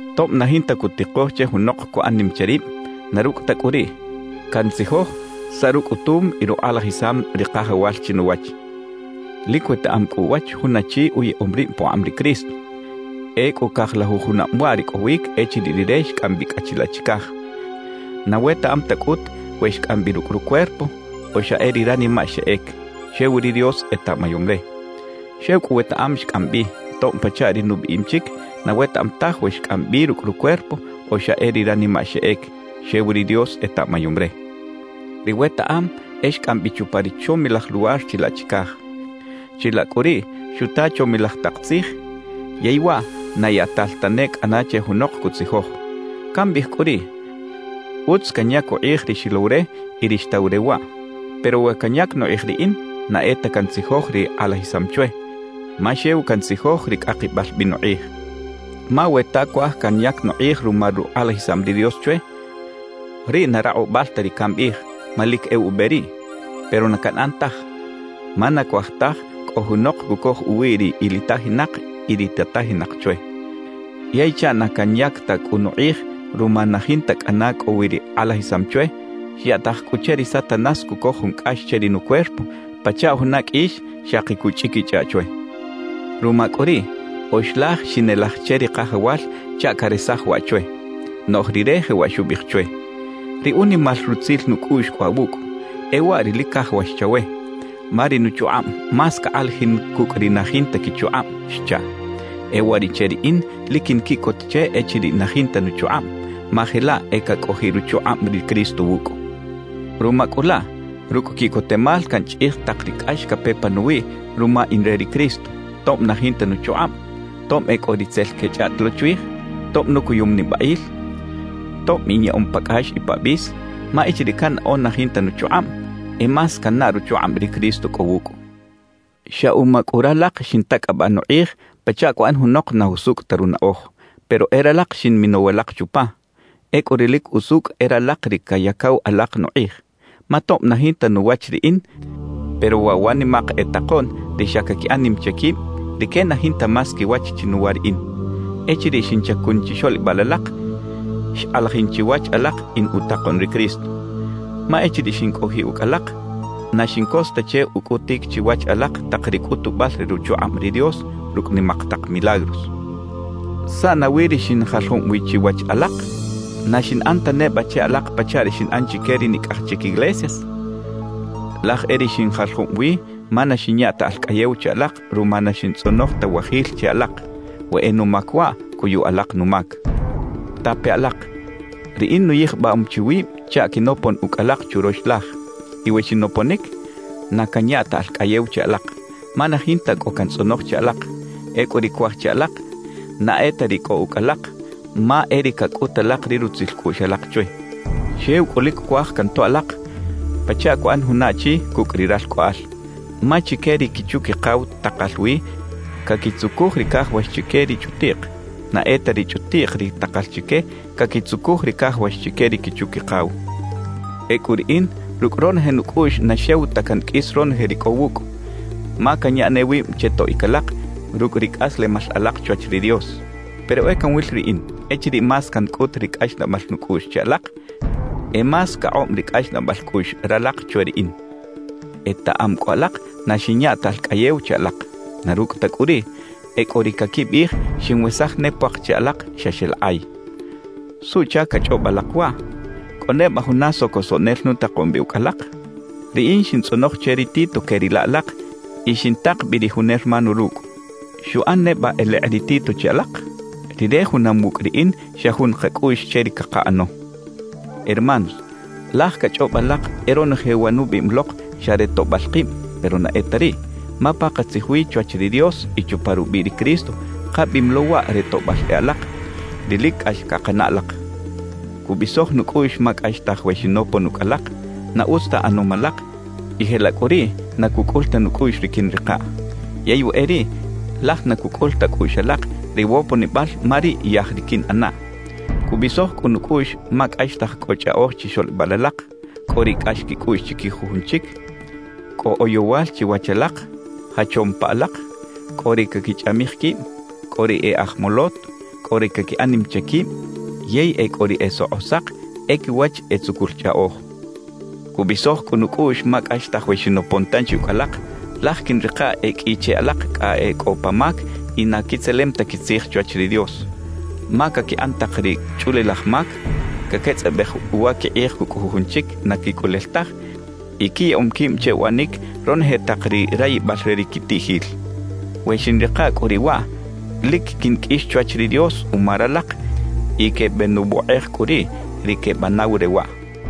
Tob na jinta cutikoj che junok cuꞌan nim che rib, na rucꞌ ta cꞌu riꞌ cantzijoj saꞌ rucꞌutum y rukꞌalajisam ri Kajawal chinuwach. Lic wetaꞌam cꞌu uwach jun achi uyaꞌom rib pukꞌab ri Cristo. Ecꞌu cajlajuj junab waꞌ ricꞌowic echiriꞌ rire xcꞌam bi cꞌa chilaꞌ chicaj. Na wetaꞌam ta cꞌut we xcꞌam bi rucꞌ rucuerpo o xa e ri ranimaꞌ xeꞌec, xew ri Dios etaꞌmayom re. Xew cꞌu wetaꞌam xcꞌam bi, tob pachaꞌ ri nubiꞌim chic, na wetaꞌam taj we xcꞌam bi rucꞌ rucuerpo o xa e ri ranimaꞌ xeꞌec, xew ri Dios etaꞌmayom re. Ri wetaꞌam, e xcꞌam bi chupa ri chomilaj luwar chilaꞌ chicaj. Chilaꞌ cꞌu riꞌ xuta chomilaj tak tzij yey waꞌ na yaꞌtal tane cꞌana che junok cutzijoj. Cambiꞌij cꞌu riꞌ, utz canyac ukꞌij ri xilow re y ri xtaw re waꞌ. Pero we canyac nukꞌij riꞌin, na e ta cantzijoj ri kꞌalajisam chwe, ma xew cantzijoj ri cꞌakibal bi nukꞌij. Ma we ta cuaj canyac nukꞌij ruma rukꞌalajisam ri Dios chwe, riꞌ na rakꞌubal ta ri cambiꞌij, ma lic e ube riꞌ. Pero na canꞌan taj, ma na cuaj taj cꞌo junok cucoj uwi ri ilitajinak y ri tatajinak chwe. Yey chaꞌ na canyac ta cꞌu nukꞌij ruma na jinta cꞌana cꞌo wi ri kꞌalajisam chwe, xyaꞌtaj cꞌu che ri Satanás cucoj jun cꞌax che ri nucuerpo pachaꞌ juna qꞌuix xaki cuchꞌiquichꞌaꞌ chwe. Ruma cꞌu riꞌ, oxlaj xinelaj che ri Kajawal chaꞌ caresaj waꞌ chwe. Noꞌj Rire jewaꞌ xubiꞌij chwe: «Ri unimal rutzil nucꞌuꞌx cꞌo awucꞌ, e waꞌ ri lic cajawax chawe. Ma ri nuchukꞌab más cakꞌalajin cucꞌ ri na jinta quichukꞌab» xchaꞌ. E uwariꞌche riꞌin lic quinquiꞌcot che echiriꞌ na jinta nuchukꞌab, ma jelaꞌ e cacꞌojiꞌ ruchukꞌab ri Cristo wucꞌ. Ruma cꞌu laꞌ, rucꞌ quiꞌcotemal canchꞌij tak ri cꞌax cape panuwiꞌ ruma in re ri Cristo, tob na jinta nuchukꞌab, tob e cꞌo ri tzel quechꞌaꞌt lo chwij, tob nucuyum nibaꞌil, tob inyaꞌom pa cꞌax y pa bis; ma echiriꞌ cannaꞌo na jinta nuchukꞌab, e más cannaꞌ ruchukꞌab ri Cristo cꞌo wucꞌ. Xa uma cꞌu ralak xintacꞌabaꞌ nukꞌij pachaꞌ cuꞌan junok na jusucꞌ ta runaꞌoj, pero e ralak xinminow alak chupa. Ecꞌu ri lic usucꞌ e ralak ri cayacaw alak nukꞌij. Ma tob na jinta nuwach riꞌin, pero waꞌ wa nimak e takoꞌn ri xa caquiꞌan nim che quib, rique na jinta más quiwach chinuwa riꞌin. Echiriꞌ xinchacun chixoꞌlibal alak, xkꞌalajin chiwach alak in utakoꞌn ri Cristo. Ma echiriꞌ xincꞌojiꞌ ucꞌ alak, na xincos ta che ucꞌutic chiwach alak tak ri cꞌutubal re ruchukꞌab ri Dios rucꞌ nimak tak milagros. ¿Saꞌ nawi ri xinjaljob wi chiwach alak? ¿Na xinꞌan ta neba che alak pachaꞌ ri xinꞌan chique ri nicꞌaj chic iglesias? Laj e ri xinjaljob wi ma na xinya ta alcꞌayew che alak ruma na xintzꞌonoj ta wajil che alak. We e numac waꞌ, cuyu alak numac. Tape alak: Riꞌin nuyijbam chi wib chaꞌ quinopon ucꞌ alak churox laj. Y we xinoponic, na canya ta alcꞌayew che alak, ma na jinta cꞌo cantzꞌonoj che alak. Ecꞌu ri cuaj che alak na e ta ri cꞌo ucꞌ alak, ma e ri cacꞌut alak ri rutzil cꞌuꞌx alak chwe. Xew cꞌu lic cuaj cantoꞌ alak pachaꞌ cuꞌan juna achi cucꞌ ri ralcꞌoꞌal. Ma chique ri quichu-quikaw takal wi caquitzucuj ri cajawax chique ri chꞌutiꞌk; na e ta ri chꞌutiꞌk ri takal chique caquitzucuj ri cajawax chique ri quichu-quikaw. Ecꞌu riꞌin rucꞌ ronoje nucꞌuꞌx na xew ta canqꞌuis ronoje ri cꞌo wucꞌ, ma canya ne wib che toꞌic alak rucꞌ ri cꞌaslemal alak chwach ri Dios. Pero e canwil riꞌin, echiriꞌ más cancꞌut ri cꞌaxnaꞌbal nucꞌuꞌx che alak, e más cakꞌob ri cꞌaxnaꞌbal cꞌuꞌx ralak chwe riꞌin. Etaꞌam cꞌu alak na xinya ta alcꞌayew che alak. Na rucꞌ ta cꞌu riꞌ, e cꞌo ri caquibiꞌij xinwesaj ne puak che alak xa xeꞌlakꞌay. ¿Suꞌchac cachꞌob alak waꞌ? ¿Cꞌo neba juna socosoꞌnel nutakom bi ucꞌ alak? Riꞌin xintzꞌonoj che ri Tito queꞌrila alak y xintak bi ri jun hermano rucꞌ. ¿Xuꞌan neba elekꞌ ri Tito che alak? Rire junam wucꞌ riꞌin xa jun kacꞌuꞌx che ri cakaꞌano. Hermanos, laj cachꞌob alak e ronoje wa nubiꞌim lok xa re toꞌbal kib, pero na e ta riꞌ. Ma pakatzij wi chwach ri Dios y chupa rubiꞌ ri Cristo kabiꞌim lo waꞌ re toꞌbal e alak, ri lic cꞌax cakanaꞌ alak. Cubisoj nucꞌuꞌx ma cꞌaxtaj we xinopon ucꞌ alak, na utz ta ꞌanom alak y jelaꞌ cꞌu riꞌ na cucꞌul ta nucꞌuꞌx ri quiꞌnrikaꞌ. Yey we e riꞌ, laj na cucꞌul ta cꞌuꞌx alak ri woponibal ma riꞌ yaj ri quiꞌnꞌanaꞌ. Cubisoj cꞌu nucꞌuꞌx ma cꞌaxtaj cꞌo chꞌaꞌoj chixoꞌlibal alak, cꞌo ri cꞌax quicꞌuꞌx chiquij jujun chic, cꞌo oyowal chiwach alak, jachom pa alak, cꞌo ri caquichꞌamij quib, cꞌo ri e aj molot, cꞌo ri caquiꞌan nim che quib yey e cꞌo ri e sokꞌosak e quiwach e tzucul chꞌaꞌoj. Cubisoj cꞌu nucꞌuꞌx ma cꞌaxtaj we xinopon tanchi ucꞌ alak, laj quiꞌnrikaꞌ e qꞌui che alak cꞌa e cꞌo pa mac y na quitzelem ta quitzij chwach ri Dios; ma caquiꞌan tak ri chꞌulilaj mac, caquetzꞌabej uwa quikꞌij cucꞌ jujun chic na quicꞌulel taj y quiyaꞌom quib che uꞌanic ronoje tak ri rayibal re ri quitiꞌjil. We xiꞌnrika cꞌu riꞌ waꞌ, lic quinqꞌuix chwach ri Dios uma ralak y quebenuwokꞌej cꞌu riꞌ ri quebanaw re waꞌ.